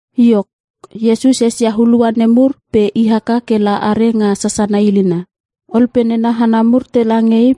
Iok, Iesus esia hulua nemur pe i haka ke la are nga sasana ilina. Ol pe nena hana mur tela nge I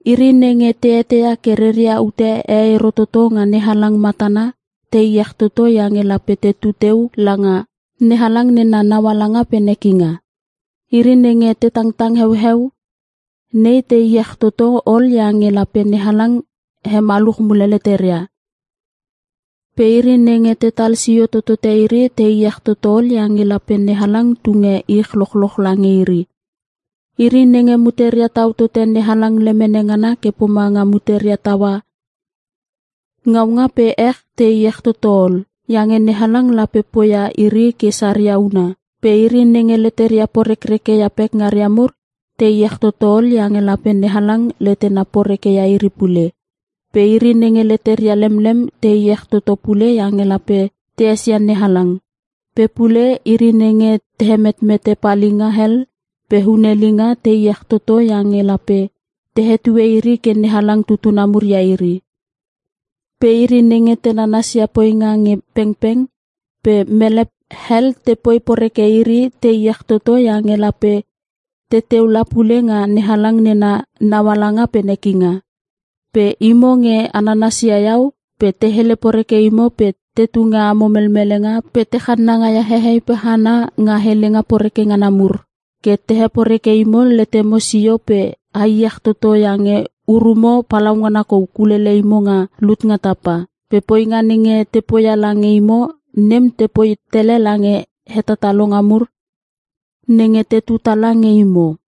“Iri nenge te eteia ke reria ute e ero toto nga NeHalang matana te iech toto iange lape tetu teu langa NeHalang nena naualanga pe nekinga. Iri nenge te tangtang heueu nei te iech toto ol iange lape NeHalang hemaluch mule leteria. Pe iri nenge tetal sio totote iri te iech toto ol iange lape NeHalang tunge ich lochloch lange iri. Iri nenge muteria tau tote NeHalang lemene ngana ke pomanga muteria taua ngaunga pe ech te iech toto ol. Iange NeHalang lape poia iri ke saria huna. Pe iri nenge leteria porekreke ia pekngaria mur te iech toto ol iange lape NeHalang letena porekeia iri pule. Pe iri nenge leteria lemlem te iech toto pule iange lape te esia NeHalang. Pe pule iri nenge te hemetmete palinga hel pe hunelinga te iech toto iange lape te hetue iri ke NeHalang tutuna mur ia iri. Pe iri nenge te nanas ia poinga nge pengpeng pe mele hel te poi poreke iri te iech toto iange lape teteu la pule nga NeHalang nena naualanga pe nekinga. “Pe imo nge a nanas ia iau pe te hele poreke imo pe te tunge amo melmelenga pe te channanga ia hehei pe hana nga helenga poreke ngana mur ke te heporeke imo letemo sio pe a iech toto iange urumo palaungana kou kulele imo nga lut nga tapa. Pe poinga nenge te poia lange imo nem te poi tele lange hetatalonga mur nenge tetu tala nge imo.”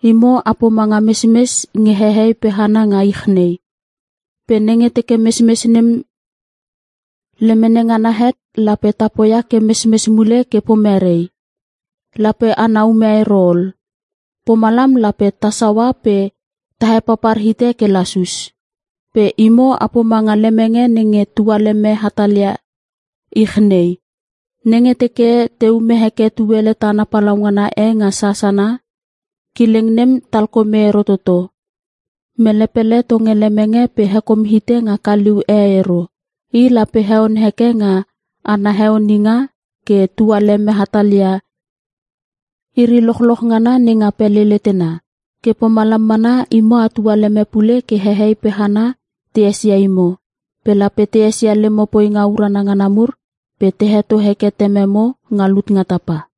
“Imo a pomanga mesmes nge hehei pe hana nga ich nei. Pe nenge teke mesmes nem lemene ngana het lape ta poia ke mesmes mule ke pomere? Lape ana ume ero ol. Pomalam lape ta saua pe ta hepapar hite ke lasus. “Pe imo a pomanga lemenge nenge tualeme hatalia ich nei. Nenge teke te ume heke tuele tana palaungana e nga sasana, kileng nem talkome ero toto. Mele pele tonge lemenge pe hekom ite nga kaliu e ero. I lape heon heke nga ana heoninga ke tualeme hatal ia iri lochloch ngana nenga pele letena. Ke pomalam mana imo a tualeme pule ke hehei pe hana te esia imo. Pe lape te esia lemo poinga urana ngana mur pe te heto heke Tememo nga lut nga Tapa.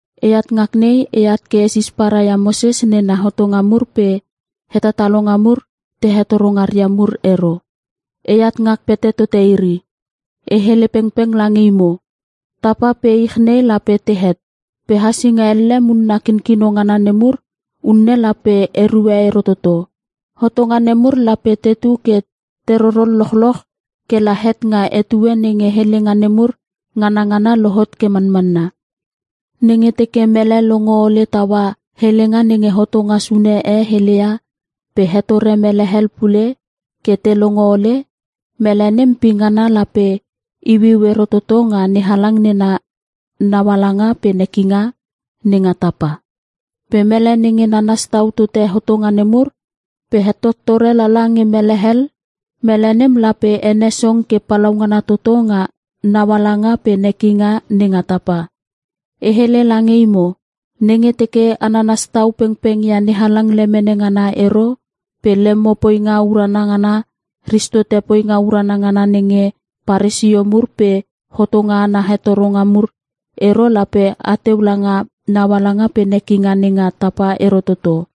“E at ngak nei e at ke e sisparai ia Moses nena hotonga mur pe hetatalonga mur te hetoro ngaria mur ero. E at ngak pete tote iri. E hele pengpeng lange imo! Tapa pe ich nei lape te het. Pe hasinga elle munna kinkino ngana nemur unne lape erue ero toto. Hotonga nemur lape tetu ke te rorol lochloch ke la het nga etue nenge helenga nemur nganangana lohot ke manmanna. Nenge teke mele longo ole taua helenga nenge hotonga sune e hele ia pe hetore mele hel pule ke te longo ole, mele nem pingana lape iuiu ero toto nga NeHalang nena naualanga pe nekinga nenga tapa. Pe mele nenge nanas tau tote hotonga nemur pe hetottore lala nge mele hel, mele nem lape ene song ke palaungana toto nga naualanga pe nekinga nenga tapa. E hele lange imo, nenge teke a nanas tau pengpeng ia NeHalang lemene ngana ero pe lemo poinga urana ngana ristote poinga urana ngana nenge Paresio mur pe hotonga ana hengetoro mur ero lape ateu langa naualanga pe nekinga nenga tapa ero toto.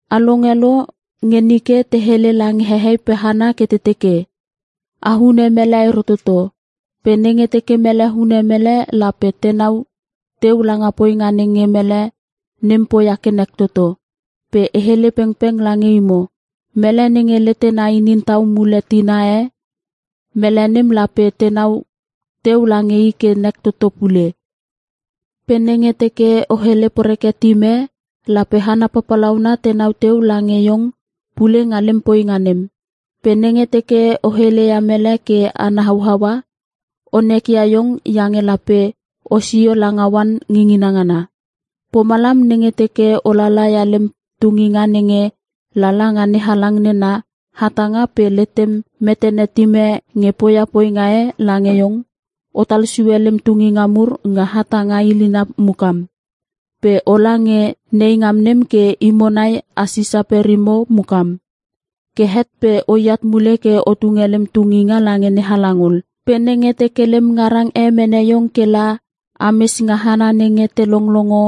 “A longe lo nge nike te hele lange hehei pe hana ke te teke, ‘O hune mele ero toto. Pe nenge teke mele hune mele lape tenau teu langa poinga nenge mele nem poia ke nek toto.’ Pe e hele pengpeng lange imo. Mele nenge letena inin tau mule tina e, mele nem lape tenau teu lange i ke nek toto pule. Pe nenge teke o hele poreke tim e, lape hana papalauna tenau teu lange iong pule nga lem poinga nem. Pe nenge teke o hele ia mele ke ana hauaua, o nekia iong iange lape osio langa oan ngingina ngana. “Pomalam nenge teke o lala ia lem tunginga nenge lala nga NeHalang nena hatanga pe letem metene tim e nge poia poinga e lange iong otal sue lem tunginga mur nga hatanga ilina mukam. Pe ola nge neingam nem ke imo nai a sisa perimo mukam. Ke het pe oat mule ke o tunge lem tunginga lange NeHalang ol. “Pe nenge teke lem ngarang e mene iong ke la ames nga hana nenge te longlongo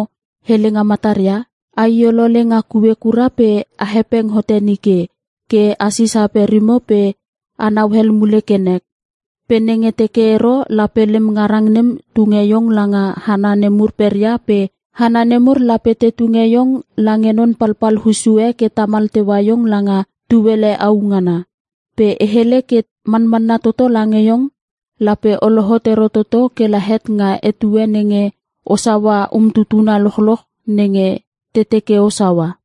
helenga mataria, a i olole nga kue kura pe a hepeng hote nike. Ke a sisa perimo pe a nauel mule ke nek. Pe nenge teke ero lape lem ngarang nem tunge iong langa hana nemur peria pe hana nemur lape te tunge iong lange non papal hussu e ke tamal teua iong langa tuele au ngana. Pe e hele ke manmanna toto lange iong lape o lohot ero toto ke la het nga etue nenge o saua umtutuna lochloch nenge te teke o saua.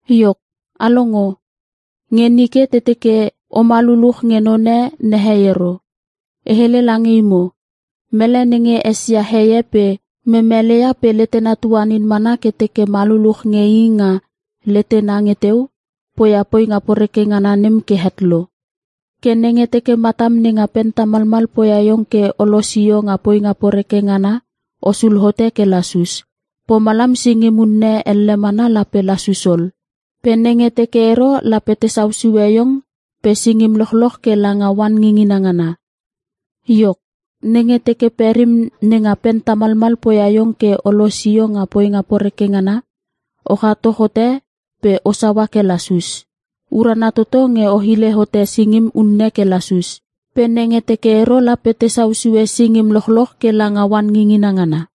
“Iok a longo, nge nike te teke, ‘Oma luluch nge none nehei ero.’ E hele lange imo, mele nenge esia heie pe memelei ia pe letena tuanin mana ke teke ma luluch nge i nga letena nge teu, poia poinga poreke ngana nem ke het lo. Ke nenge teke matam nenga pen tamalmal poia iong ke o losio nga poinga poreke ngana o sulhote ke lasus. Pomalam singim unne elle mana lape lasus ol. Pe nenge teke ero lape te sausue iong pe singim lochloch ke langa oan ngingina ngana. Iok, nenge teke perim nenga pen tamalmal poia iong ke o losio nga poinga poreke ngana o chato hote pe o saua ke lasus. Urana toto nge o hile hote singim unne ke lasus. Pe nenge teke ero lape tesau sue singim lochloch ke langa oan ngingina ngana.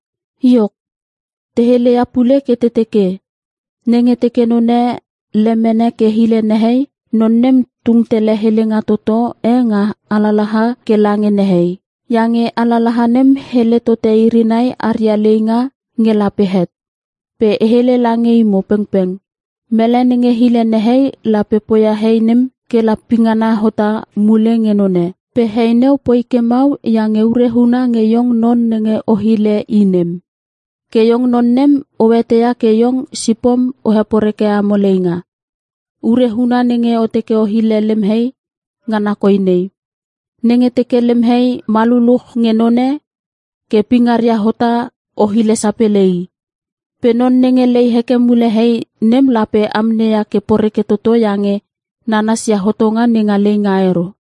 “Iok, te heleia pule ke te teke, ‘Nenge teke none lemene ke hile nehei non nem tung tele helenga toto e nga alalaha ke lange nehei. Iange alalaha nem hele tote iri nai aria leinga nge lape het.’ Pe e hele lange imo pengpeng mele nenge hile nehei lape poia hei nem ke la pingana hota mule nge none. Pe hei neu poi ke mau iange ure huna nge iong non nenge o hile i nem. Ke iong non nem o eteia ke iong sipom o heporeke amo leinga. Ure huna nenge o teke o hile lem hei ngana koi nei; Nenge teke lem hei ma luluch nge none ke pingaria hota o hile sapele i. Pe non nenge lei heke mule hei nem lape amneia ke poreke toto iange nanas ia hotonga nenga leinga ero.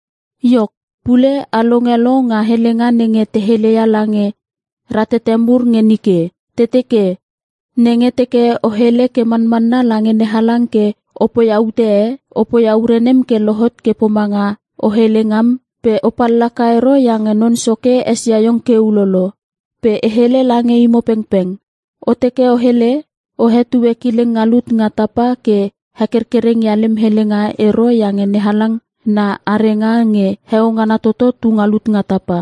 “Iok, pule a longe lo nga helenga nenge te heleia lange ratete mur nge nike. Te teke, ‘Nenge teke o hele ke manmanna lange NeHalang ke o poia ute e, o poia ure nem ke lohot ke pomanga o hele ngam pe o pallaka ero iange Non Soke esia iong ke ulolo.’ Pe e hele lange imo pengpeng, o teke o hele, o hetue kileng nga lut nga tapa ke hekerkereng ia lem helenga ero iange NeHalang na arenga nge heo ngana toto tu nga lut nga Tapa.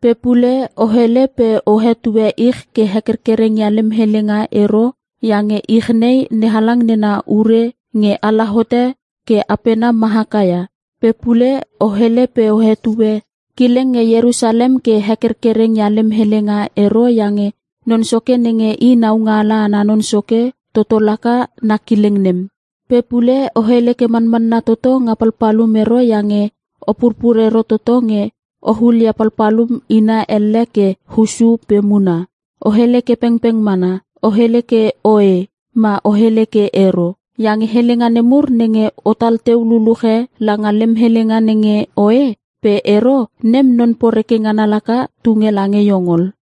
Pe pule o hele pe o hetue ich ke hekerkereng ia lem helenga ero iange ich nei NeHalang nena ure nge ala hote ke apena ma haka ia. Pe pule o hele pe o hetue kileng nge Ierusalem ke hekerkereng ia lem helenga ero iange Non Soke nenge i naungaala ana non soke toto laka na kileng nem. Pe pule o hele ke manmanna toto nga palpalum ero iange o purpur ero toto nge o hulia palpalum ina elle ke hussu pe muna. O hele ke pengpeng mana. O hele ke ‘Oe’ ma o hele ke ‘Ero’. Iange helenga nemur nenge otal teu luluche langa lem helenga nenge ‘oe’ pe ‘ero’ nem non poreke ngana laka tunge lange iong ol.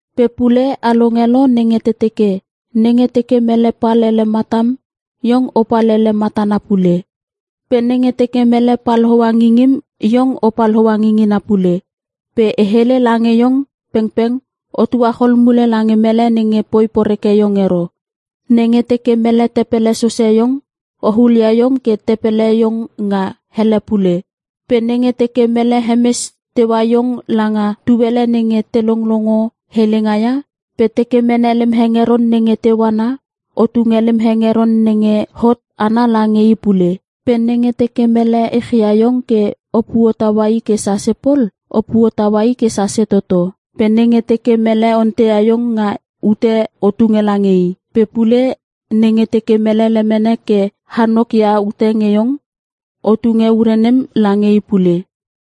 “Pe pule a longe lo nenge te teke, ‘Nenge teke mele pal ele matam iong o pal ele matana pule. Pe nenge teke mele pal hoa ngingim iong o pal hoa ngingina pule.’ Pe e hele lange iong pengpeng o tuachol mule lange mele nenge poi poreke iong ero. Nenge teke mele tepele sose iong o hulia iong ke tepele iong nga ele pule. Pe nenge teke mele hemes teua iong langa tuele nenge te longlongo helenga ia pe teke mene lem hengeron nenge teu ana o tunge lem hengeron nenge ot ana lange i pule. Pe nenge teke mele echia iong ke o puotaua i ke sase pol o puotaua i ke sase toto. Pe nenge teke mele onteia iong nga ute o tunge lange i. Pe pule nenge teke mele lemene ke hanok ia ute nge iong, o tunge ure nem lange i pule.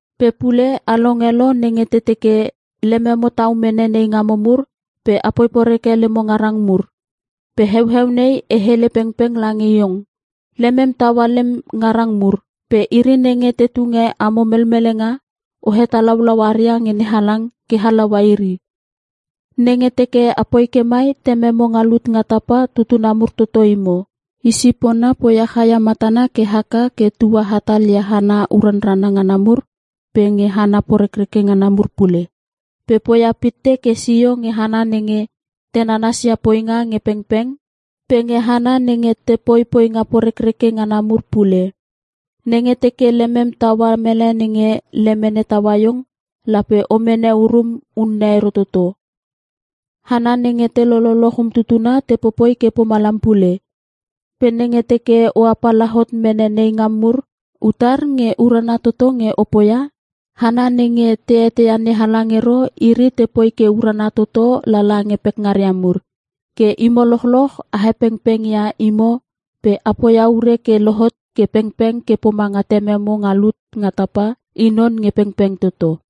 “Pe pule a longe lo nenge te teke, ‘Lememo tau mene neingamo mur pe apoi poreke lemo ngarang mur.’ Pe heueu nei e hele pengpeng lange iong. Lemem taua lem ngarang mur. Pe iri nenge te tunge amo melmelenga o hetalaulau aria nge NeHalang ke halaua iri. Nenge teke apoi ke mai Tememo nga lut nga tapa tutuna mur toto imo. I sipona poia chaia matana ke haka ke tua hatal ia hana uranrana ngana mur pe nge hana porekreke ngana mur pule. Pe poia pitte ke sio nge hana nenge te nanas ia poinga nge pengpeng pe nge hana nenge te popoi poinga porekreke ngana mur pule. Nenge teke lemem taua mele nenge lemene taua iong lape o mene urum unne ero toto. Hana nenge te lololoch umtutuna te popoi ke pomalam pule. Pe nenge teke o apala hot mene neingam mur utar nge urana toto nge o poia? Hana nenge te eteia NeHalang ero iri te poi ke urana toto lala nge pekngaria mur. Ke imo lochloch a hepengpeng ia imo pe a poia ure ke lohot ke pengpeng ke pomange Tememo nga lut nga tapa I non nge pengpeng toto.